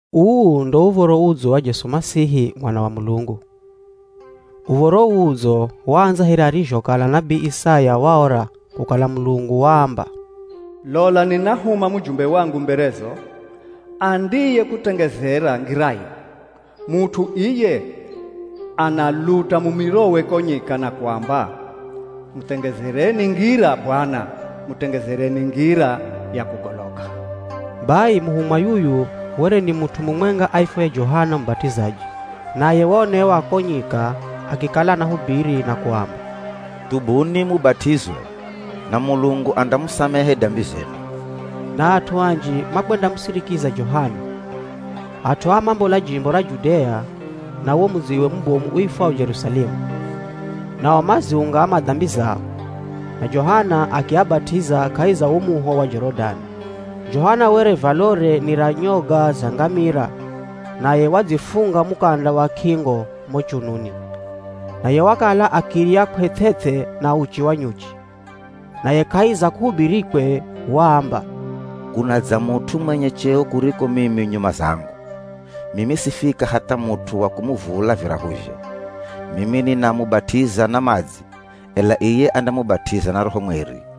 Uu ndo Uv̱oro Udzo wa Jesu Masihi Mwana wa Mulungu. Uv̱oro uu Udzo waandza here arizhokala nabii Isaya waora kukala Mulungu waamba, “Lola ninahuma mujumbe wangu mberezo, andiyekutengezera ngirayo. Mut'u iye analuta mumirowe ko nyika na kuamba, ‘Mutengezereni ngira Bwana, Mutengezereni ngira ya kugoloka.’” Bai muhumwa yuyu were ni mut'u mumwenga aifwaye Johana Mubat'izaji naye waonewa ko nyika akikala anahubiri na kuamba, “Thubuni mubat'izwe, na Mulungu andamusamehe dambi zenu.” Na at'u anji makwendamusirikiza Johana. At'u aa mambola jimbo ra Judea na wo mudziwe mubomu uifwao Jerusalemu. Nao maziungama dambi zao, na Johana akiabat'iza kahi za wo muho wa Jorodani. Johana were valore ni ra nyoga za ngamira naye wadzifunga mukanda wa k'ingo mo chununi. Naye wakala akirya kw'eth'eth'e na uchi wa nyuchi. Naye kahi za kuhubirikwe waamba, “Kunadza mut'u mwenye cheo kuriko mimi nyuma zangu. Mimi sifika hatha mut'u wa kumuvula virahuzhe. Mimi ninamubat'iza na madzi, ela iye andamubat'iza na Roho Mweri.”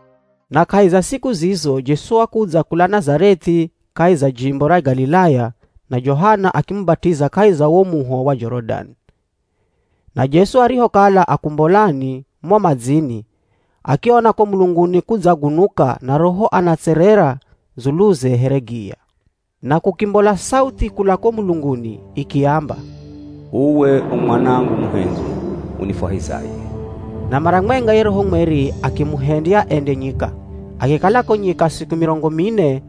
Na kahi za siku zizo Jesu wakudza kula Nazareth'i kahi za jimbo ra Galilaya na Johana akimubat'iza kahi za wo muho wa Jorodani. Na Jesu arihokala akumbolani mo madzini, akiona ko mulunguni kudzagunuka na Roho anatserera dzuluze here giya. Na kukimbola sauthi kula ko mulunguni ikiamba, “Uwe u Mwanangu muhendzwi, unifwahizaye.” Na mara mwenga ye Roho Mweri akimuhendya ende nyika. Akikala ko nyika siku mirongo mine,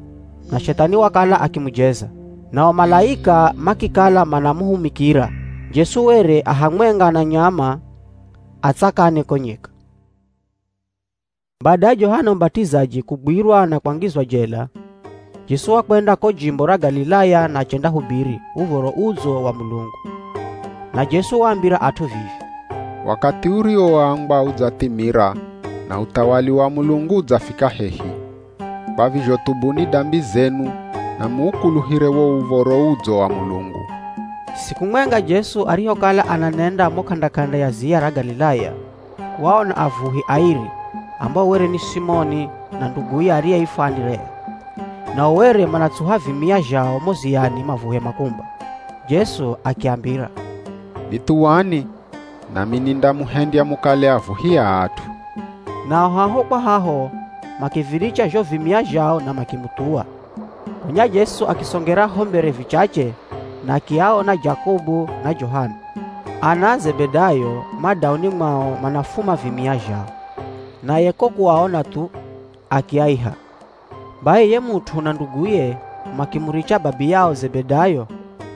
na Shethani wakala akimujeza. Nao malaika makikala manamuhumikira. Jesu were a hamwenga na nyama a tsakani ko nyika. Bada ya Johana Mubat'izaji kugwirwa na kwangizwa jela, Jesu wakwenda ko jimbo ra Galilaya na achendahubiri Uv̱oro Udzo wa Mulungu. Na Jesu waambira at'u vivi, “Wakathi uriwoambwa udzathimira na uthawali wa Mulungu udzafika hehi. Kwa vizho thubuni dambi zenu na muukuluhire wo Uv̱oro Udzo wa Mulungu.” Siku mwenga Jesu arihokala ananenda mo k'anda-k'anda ya ziya ra Galilaya, waona avuhi airi, ambao were ni Simoni na nduguye ariyeifwa Anderea. Nao were manatsuha vimia zhao mo ziyani mavuhe makumba. Jesu akiambira, “Nithuwani, nami nindamuhendya mukale avuhi a at'u.” Nao haho kwa haho, makiviricha zho vimia zhao na makimuthuwa. Gonya Jesu akisongera ho mbere vichache na akiaona Jakobu na Johana, ana a Zebedayo ma dauni mwao manafuma vimia zhao. Naye ko kuaona thu, akiaiha. Bai ye mut'u na nduguye makimuricha babiyao Zebedayo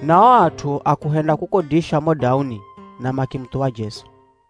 na o at'u a kuhenda kukodisha mo dauni na makimuthuwa Jesu.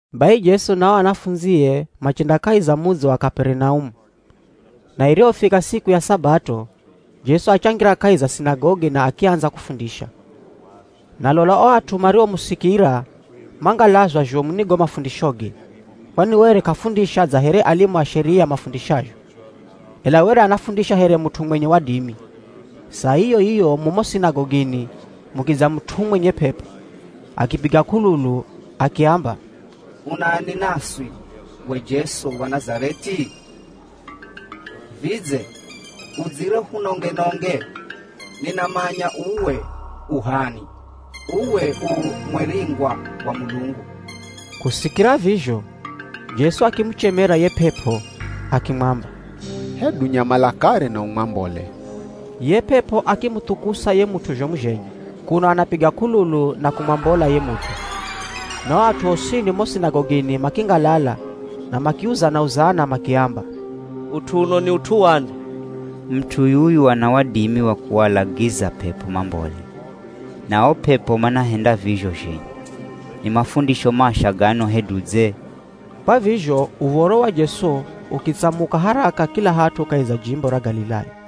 Bai Jesu na o anafundzie machenda kahi za mudzi wa Kaperinaumu, na irihofika siku ya Sabato, Jesu achangira kahi za sinagogi na akiandza kufundisha. Na lola o at'u mariomusikira mangalazwa zhomu ni go mafundishoge, kwani were k'afundisha dza here alimu a Sheria mafundishazho, ela were anafundisha here mut'u mwenye wadimi. Saa iyo-iyo mumo sinagogini mukidza mut'u mwenye p'ep'o. Akipiga k'ululu, akiamba, “Unani naswi we Jesu wa Nazareth'i? Vidze udzire uhunonge-nonge? Ninamanya uwe u h'ani. Uwe u Mweringwa wa Mulungu!” Kusikira vizho, Jesu akimuchemera ye p'ep'o, akimwamba, “Hedu nyamala kare na umwambole.” Ye p'ep'o akimuthukusa ye mut'u zhomu zhenye, kuno anapiga k'ululu na kumwambola ye mut'u. Na o at'u osini mo sinagogini makingalala na makiuzana-uzana makiamba, “Ut'u uno ni ut'u wani? Mut'u yuyu ana wadimi wa kualagiza p'ep'o mambole, na o p'ep'o manahenda vizho zhenye! Ni mafundisho masha gano hedu dze!” Kwa vizho uv̱oro wa Jesu ukitsamuka haraka kila hat'u kahi za jimbo ra Galilaya.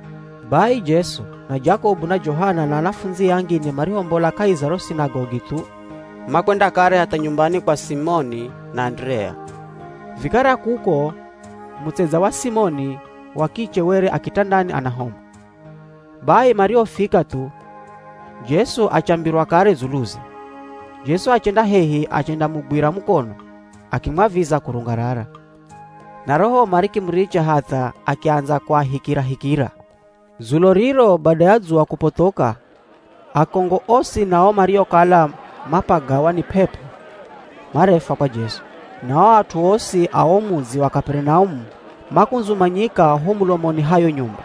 Bai Jesu, na Jakobu, na Johana na anafundzie angine marihombola kahi za ro sinagogi thu, makwenda kare hatha nyumbani kwa Simoni na Anderea. Vikara kuko, mutsedza wa Simoni wa kiche were a kitandani ana homa. Bai marihofika thu, Jesu achambirwa kare dzuluze. Jesu achenda hehi achendamugwira mukono, akimwaviza kurungarara. Na ro homa rikimuricha hatha akiandza kuahikirahikira. Dzulo riro bada ya dzuwa kupothoka, akongo osi na o mariokala mapagawa ni p'ep'o marefwa kwa Jesu. Na o at'u osi a wo mudzi wa Kaperinaumu makundzumanyika ho mulomoni ha yo nyumba.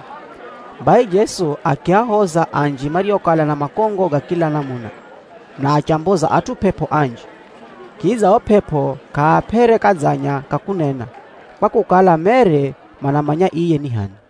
Bai Jesu akiahoza anji mariokala na makongo ga kila namuna, na achamboza at'u p'ep'o anji. Kidza o p'ep'o k'aap'ere kadzanya ka kunena, kwa kukala mere manamanya iye ni h'ani.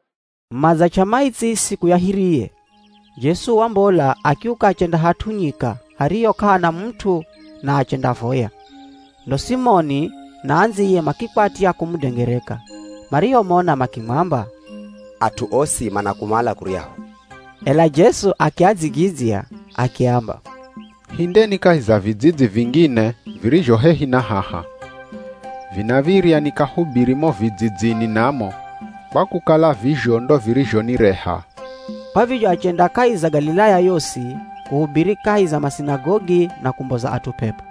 Madzach'a maitsi siku ya hiriye, Jesu wambola, akiuka achenda hat'u nyika hariho k'ahana mut'u na achendavoya. Ndo Simoni na andziye makikwatya kumudengereka. Marihomona makimwamba, “At'u osi manakumala kuryahu” Ela Jesu akiadzigidzya akiamba, “Hindeni kahi za vidzidzi vingine virizho hehi na haha. Vinav̱irya nikahubiri mo vidzidzini namo, kwa kukala vizho ndo virizhonireha.” Kwa vizho achenda kahi za Galilaya yosi, kuhubiri kahi za masinagogi na kumboza at'u p'ep'o.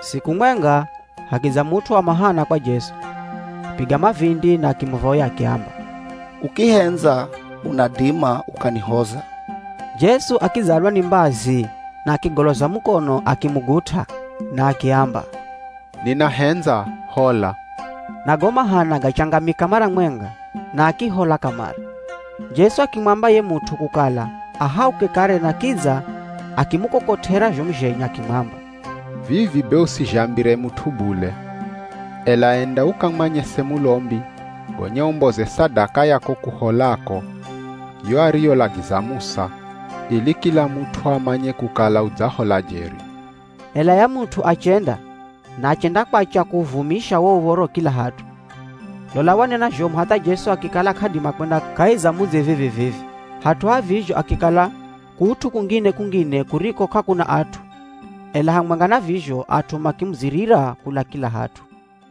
Siku mwenga, hakidza mut'u wa mahana kwa Jesu, akipiga mavindi na akimuvoya akiamba, “Ukihendza unadima ukanihoza!” Jesu akidzalwa ni mbazi na akigoloza mukono akimugut'a na akiamba, “Ninahendza, hola!” Na go mahana gachangamika mara mwenga na akihola kamare. Jesu akimwamba ye mut'u kukala ahauke kare na kidza akimukokot'era zhomu zhenye akimwamba, “Vivi be usizhambire mut'u bule, ela enda ukamwanyese mulombi, gonya umboze sadaka ya ko kuholako, yo ariyolagiza Musa, ili kila mut'u amanye kukala udzahola jeri.” Ela ye mut'u achenda, na achendakwacha kuuvumisha wo uv̱oro kila hat'u. Lola, wanena zhomu hatha Jesu akikala k'adima kwenda kahi za mudzi vivi-vivi, hat'u ha vizho akikala kut'u kungine-kungine kuriko k'akuna at'u, ela hamwenga na vizho at'u makimudzirira kula kila hat'u.